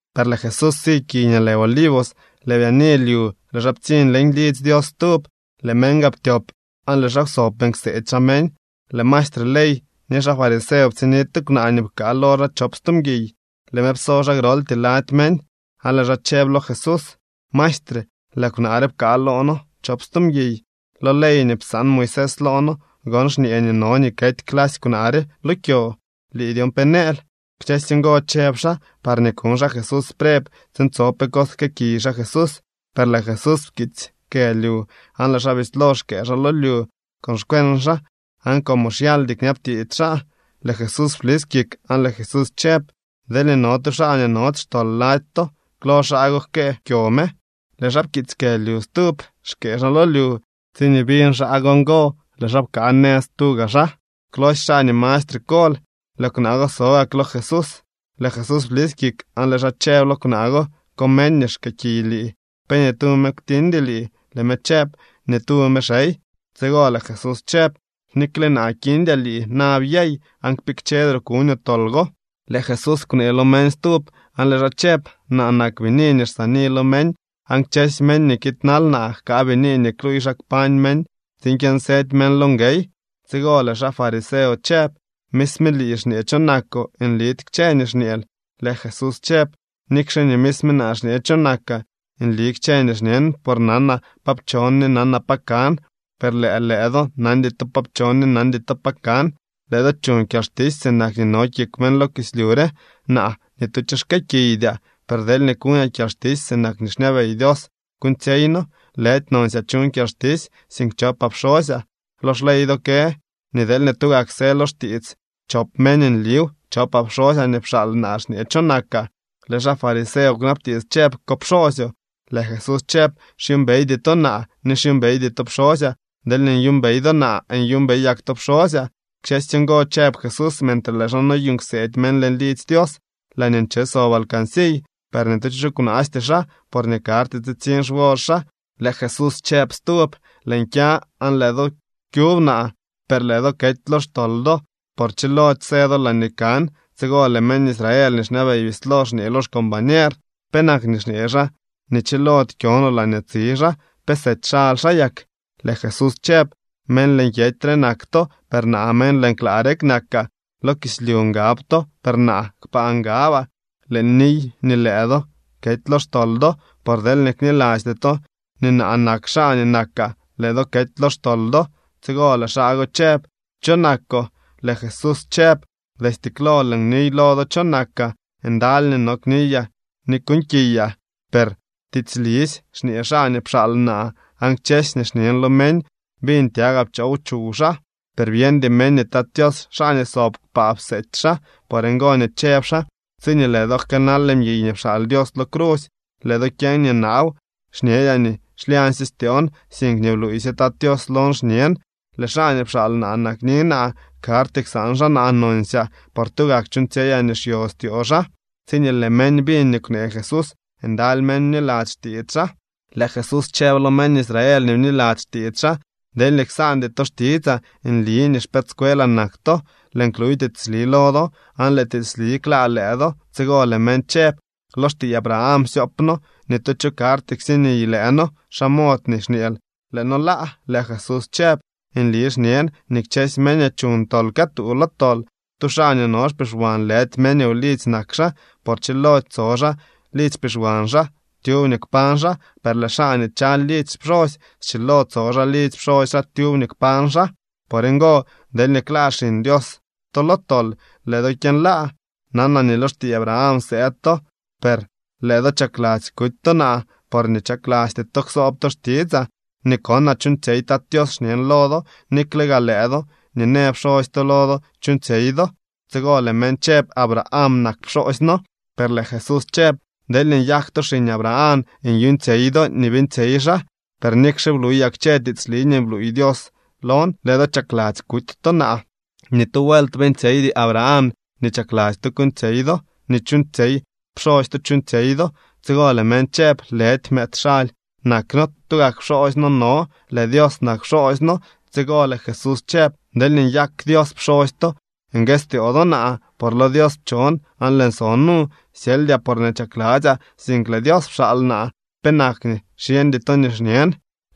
Per lëë Jesús si kiy nii lë Olivos. Lëë byaani lyu lëë xaa ptsiñ leñ lidzy Dios stub. Lëë meñ gaa ptyop aan lëë xaa kwsob beeñ kseedy xaa meñ. Lëë maestre ley ni xaa fariseo ptsiñni tu kwnaa nii pkaa lo xaa chop stu mguiy. Lëë me pso xaa groltyee lady meñ, aan lëë xaa chëb lo Jesús: —Maestre, lëë kwnaa re pkaa loo noo chop stu mguiy. Lo ley nii psaan Moisés loo noo gon xñee nii no nii kety clasy kwnaa re lo kyo. ¿Lii, dyon pe nëël? Kchësy ngo chëb xaa parñee kuñ xaa Jesús preb tsiin tso pe cos jkëëkiy xaa Jesús. Per lëë Jesús pkiitsy kë lyu aan lëë xaa bislo xkëë xaa lo lyu con xkweñ xaa. Aan como xyaldy kñabtiits xaa, lëë Jesús blis kik aan lëë Jesús chëb: —Deelñee no tu xaa nii nody xtol lady to, klo xaa go jkëë kyo me. Lëë xaa pkiitsy kë lyu stub, xkëë xaa lo lyu. Tsiñee biñ xaa go ngo, lëë xaa pkaa nëz tuga xaa, klosy xaa nii mastre kol. Lëë kwnaa go so gak lo Jesús. Lëë Jesús blis kik aan lëë xaa chëb lo kwnaa go: —¿Ko meñ nii xkëëkiy lii? ¿Pe ni tu me kwtiñdy lii? Lëë me chëb: —Ni tu me, xey. Tsigo lëë Jesús chëb: —Nikle naa kiñdyaa lii. Na byey aan kpikchedroo kuñoo tol go. Lëë Jesús kwnee lo meñ stub aan lëë xaa chëb: —Naa nak bini nii xsaani lo meñ, aan kchësy meñ nii kiidnal naa jkaa bini nii kluuy xa kpañ meñ tsiin kyënsëdy meñ lo nguey. Tsigo lëë xaa fariseo chëb: —Misme lii xñee cho nakoo. Nlidy kchë nii xñeel. Lëë Jesús chëb: —Nikxe nii misme naa xñe cho nakaa, nli kchë nii xñen. Por nanaa pa pchon ni nanaa pa kan, per lëë lëë do nandy to pa pchon ni nandy to pa kan. Lëë do chuñ kyalxtisy sinak nii no kik meñ lo kislyu re. Naa, ni tu cho xkëëkiydyaa. Per deelñee kuñaa kyalxtisy, sinak nii xñabey Dios kuuñtsyeyno. Lëdy nonsyaa chuñ kyalxtisy, sink chopaa pxosyaa. Lo xley do kë nii deelñee tugak së lo xtiits chop meñ, nliw. Chopaa pxosyaa nii pxaal naa xñe cho nakaa. Lëë xaa fariseo kwnabtiits chëb: —¿Ko pxoosyoo? Lëë Jesús chëb: —Xyuumbeydy to naa, ni xyuumbeydy to pxosyaa. Deelñee nyuumbey do naa, nyuumbeyak to pxosyaa. Kchësy ngo chëb Jesús mentre lëë xaa noyuuñ kseedy meñ leñ lidzy Dios laañee nche sob alcansiy. Per ni tu cho kwnaasty xaa, porñee karty tsitsiñ xwor xaa. Lëë Jesús chëb stub: —Lëën kya aan lëë do kyub naa, per lëë do kety lo xtol do, por chilody së do laañee kan. Tsigo lëë meñ Israel nii xñabey bislo xñee lo xcombañer: —¿Penak nii xñee xaa nii chilody kyo no laañee tsi xaa? ¿Pe sety xaly xaa yak? Lëë Jesús chëb: —Meñ leñ kyety re nak to, per naa meñ leñ klaa rek nakaa. Lo kislyu ngab to, per naa kpaa ngabaa. Lëën niy nii lëë do kety lo xtol do, por deelñee knilasty to nii naa nak xaa nii nakaa, lëë do kety lo xtol do. Tsigo lëë xaa go chëb: —¿Cho nakoo? Lëë Jesús chëb: —Destye klo lëën niy lo do cho nakaa. Ndaly nii no kniyaa ni kuuñkiyaa, per tiitslisy xñee xaa nii pxaal naa, aan kchësy nii xñen lo meñ biñ tyagaa pchoow chuw xaa. Per byeñdy meñ nii Tat Tios xaa nii sob kpaa pseety xaa. Por ngo nii chëb xaa: —Tsiñee lëë do jkëënal mguiy nii pxaal Dios lo crusy, lëë do kyeñ nii naaw. Xñedyaa nii xlyañsye styoon, sink nii bluuysye Tat Tios lon xñen. Lëë xaa nii pxaal naa nakni naa. Karty ksaan xaa naa nonsyaa, por tugak chuuñtsyeyaa nii xyostyoo xaa. Tsiñee lëë meñ biñ nii kwnee Jesús, ndaly meñ bniladzy xtiits xaa. Lëë Jesús chëb lo meñ Israel nii bniladzy xtiits xaa: —Deelñee ksaandy to xtitsaa, nli nii xpëëdscuelaa nak to. Lëën kluy tiitsli lo do, aan lëë tiitsli klaa lëë do. Tsigo lëë meñ chëb: —Lo xtiiy Abraham xsyoop noo. Ni tu cho karty ksiniy lëë noo. ¿Xa mod nii xñeel lëë noo laa? Lëë Jesús chëb: —Nli xñen nii kchësy meñ nii chuñ tol këtuu lo tol. Tu xaa nii no xpixwan lëdy meñ wlidzy nak xaa, por chilody tso xaa lidzy xpixwan xaa tyub nii kpañ xaa. Per lëë xaa nii chaly lidzy pxosy schilo tso xaa lidzy pxosy xaa tyub nii kpañ xaa. Por ngo, deelñee klaa Xiñ Dios to lo tol, lëë do kyënlaa. Nanaa nii lo xtiiy Abraham sëëd to, per lëë do chakladzy kuty to naa, porñee chaklasty to ksoob to xtitsaa. Nii konaa chuuñtsyey Tat Tios xñen lo do, nikle gaa lëë do nii në pxosy to lo do chuuñtsyey do. Tsigo lëë meñ chëb: —Abraham nak pxoosy noo. Per lëë Jesús chëb: —Deelñee nyak to xiñ Abraham nyuuñtsyey do nii beeñtsyey xaa. Per nikxe bluyaa kchë tiitsli nii bluuy Dios lon, lëë do chakladzy kuty to naa. ¡Ni tu vuelt beeñtsyeydy Abraham nii chakladzy to kuuñtsyey do! Nii chuuñtsyey pxosy to chuuñtsyey do. Tsigo lëë meñ chëb: —Lëdy mëëd xaly nak noo. Tugak pxoosy noo no. Lëë Dios nak pxoosy noo. Tsigo lëë Jesús chëb: —Deelñee nyak Dios pxosy to nguëstyoo do naa, por lo Dios pchon aan lëën so nu. Syeldyaa porñee chakladzyaa, sink lëë Dios pxaal naa. ¿Penak nii xyeñdy to nii xñen?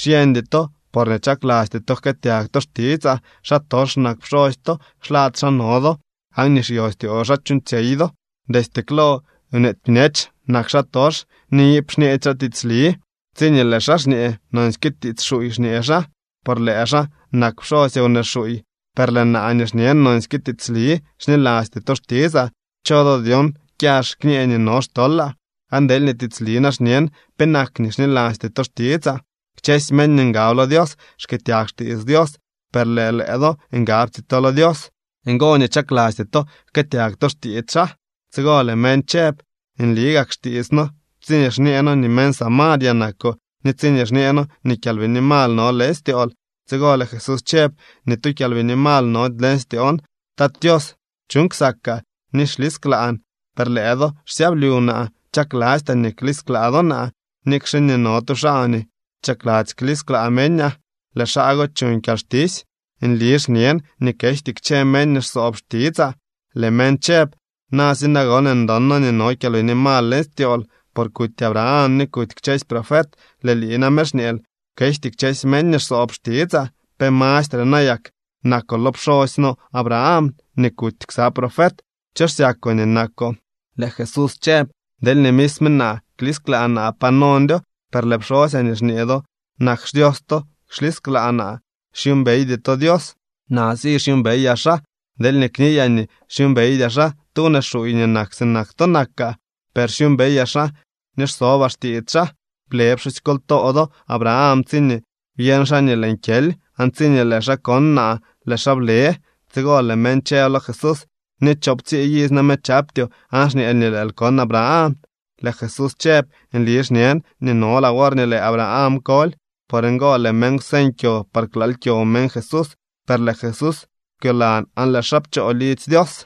Xyeñdy to porñee chaklasty to jkëëtyag to xtitsaa. Xaa tox nak pxosy to, xlad xaa no do aan nii xyostyoo xaa chuuñtsyey do. Destye klo nweety bñech nak xaatox ni iip xñeedy xaa tiitsli. Tsiñee lëë xaa xñee, nonsyke tiits xuuy xñee xaa, por lëë xaa nak pxosy wnee xuuy. Per lëë naa nii xñen nonsyke tiitsli, xnilasty to xtitsaa. ¿Cho do dyon kyax kñë nii no xtolaa? Aan deelñee tiitsli na xñen, ¿penak nii xnilasty to xtitsaa? Kchësy meñ nii ngab lo Dios xkëëtyag xtiits Dios, per lëë lëë do ngabty to lo Dios, ngo nii chaklasty to jkëëtyag to xtiits xaa. Tsigo lëë meñ chëb: —Nli gak xtiits noo tsiñee xñee noo nii meñ Samaria nakoo ni tsiñee xñee noo nii kyalbini mal no leñ styool. Tsigo lëë Jesús chëb: —Ni tu kyalbini mal nody leñ styoon. Tat Tios chuuñ ksakaa ni xlisklaan, per lëë do xsyablyu naa. Chaklastyaa nii klisklaa do naa, nikxe nii no tu xaa nii chakladzy klisklaa meñaa. Lëë xaa go chuñ kyalxtisy. Nli xñen nii kejty kchë meñ nii xsoob xtitsaa. Lëë meñ chëb: —Na si nagon, ndon noo nii no kyalbini mal leñ styool, por kuty Abraham ni kuty kchësy profet. Lëë lii name xñeel: “Kejty kchësy meñ nii xsoob xtitsaa.” ¿Pe mastre nayak nakoo lo pxoosy noo Abraham nii kuty ksa profet? ¿Cho xsyakoo nii nakoo? Lëë Jesús chëb: —Deelñee misme naa klisklaa naa, pa nondyo. Per lëë pxosyaa nii xñee do nak xDios to xlisklaa naa. Xyuumbeydy to Dios. Naa si xyuumbeyaa xaa. Deelñee kniyaa nii xyuumbeydyaa xaa, tu wnee xuuy nii nak sinak to nakaa. Per xyuumbeyaa xaa ni xsobaa xtiits xaa. Ble pxusykoltoo do Abraham tsiñee byeñ xaa nii lëën kyely, aan tsiñee lëë xaa kon naa, lëë xaa ble. Tsigo lëë meñ chëb lo Jesús: —Ni choowptsii iz name chaptyoo, ¿aan xñeel nii lëël kon Abraham? Lëë Jesús chëb: —Nli xñen nii nolaa worñee lëë Abraham koly. Por ngo lëë meñ kwseñ kyo par klaal kyo meñ Jesús, per lëë Jesús kwyolan aan lëë xaa pchoo lidzy Dios.